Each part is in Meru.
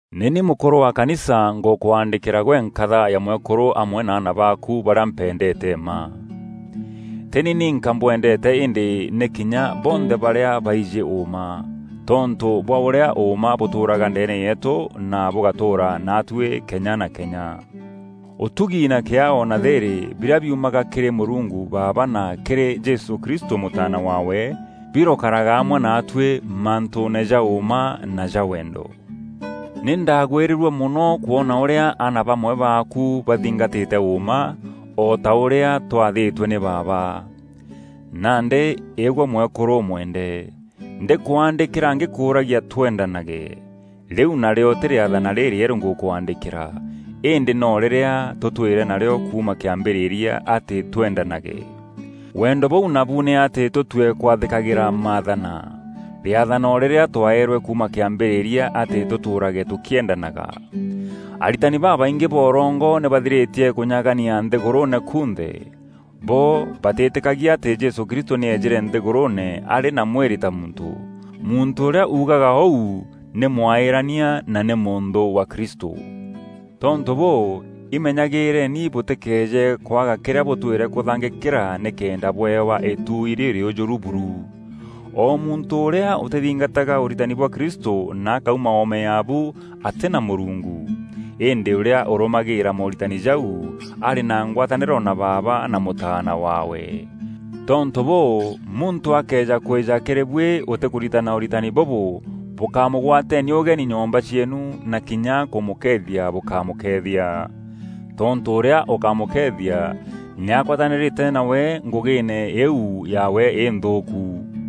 Nî ni mûkûrû wa kanisa ngûkwaandîkîra gwe nkatha ya mwekûrû amwe na aana baaku barîa mpendeete mma. Tî ni ninka mbwendeete îndî nî kinya bonthe barîa baijî ûûma, tontû bwa ûrîa ûûma bûtûûraga ndeene yeetû na bûgatûûra naatuî kenya na kenya. Ûtugi na kîaao na thîîrî, birîa biumaga kîrî Mûrungu Baaba na kîrî Jesû Kristû Mûtaana waawe, birokaraga amwe naatuî mantûûne ja ûûma na ja wendo. Nî ndaagwîrîrue mono kwona ûrîa aana bamwe baaku bathingatîte ûûma, o ta ûrîa twathîtwe nî Baaba. Nandî îgwe mwekûrû ûmwende, ndîkwaandîkîra ngîkûûragia twendanage. Rîu narîo tî rîathana rîrîerû ngûkwaandîkîra, îndî no rîrîa tûtwîre narîo kuuma kîambîrîria atî twendanage. Wendo bûu nabu nî atî tûtue kwathîkagîra maathana. Rîathana o rîrîa twaeerwe kuuma kîambîrîria atî tûtûûrage tûkîendanaga. Aritani babaingî ba ûrongo nî bathirîtie kûnyagania nthîgûrûûne kunthe. Bo batîîtîkagia atî Jesû Kristû nî eejîre nthîgûrûûne arî na mwîrî ta muntû. Muntû ûrîa uugaga ûu nî mwaîîrania na nî mûnthû wa Kristû. Tontû bûû, imenyagîîreni bûtîkeeje kwaga kîrîa bûtwîre kûthangîkîra nîkenda bweewa îtuui rîrîûjûru buru. O muntû ûrîa ûtîthingataga ûritani bwa Kristû na akauma oome yaabu, atî na Mûrungu. Îndî ûrîa ûrûmagîrîra mooritani jau, arî na ngwatanîro na Baaba na Mûtaana waawe. Tontû bûû, muntû akëeja kwîja kîrî buî ûtîkûritana ûritani bûbû, bûkámûgwateeni ûgeni nyomba cieenu na kinya kûmûkeethia bûkamûkeethia. Tontû ûrîa ûkamûkeethia nî agwatanîrîte nawe ngûgîîne îîu yaawe înthûûku.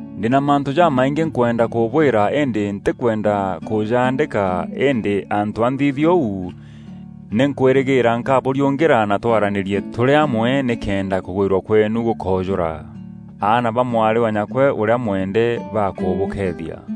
Ndî na mantû jamaingî nkwenda kûbwîra îndî ntîkwenda kûjaandîka îndî antû a nthithia ûu, nî nkwîrîgîîra nkabûriûngîra na twaranîrie tûrî amwe, nîkenda kûgwîrua kweenu gûkoojûra. Aana ba mwarî wa nyakwe ûrîa mwende bakûbûkeethia.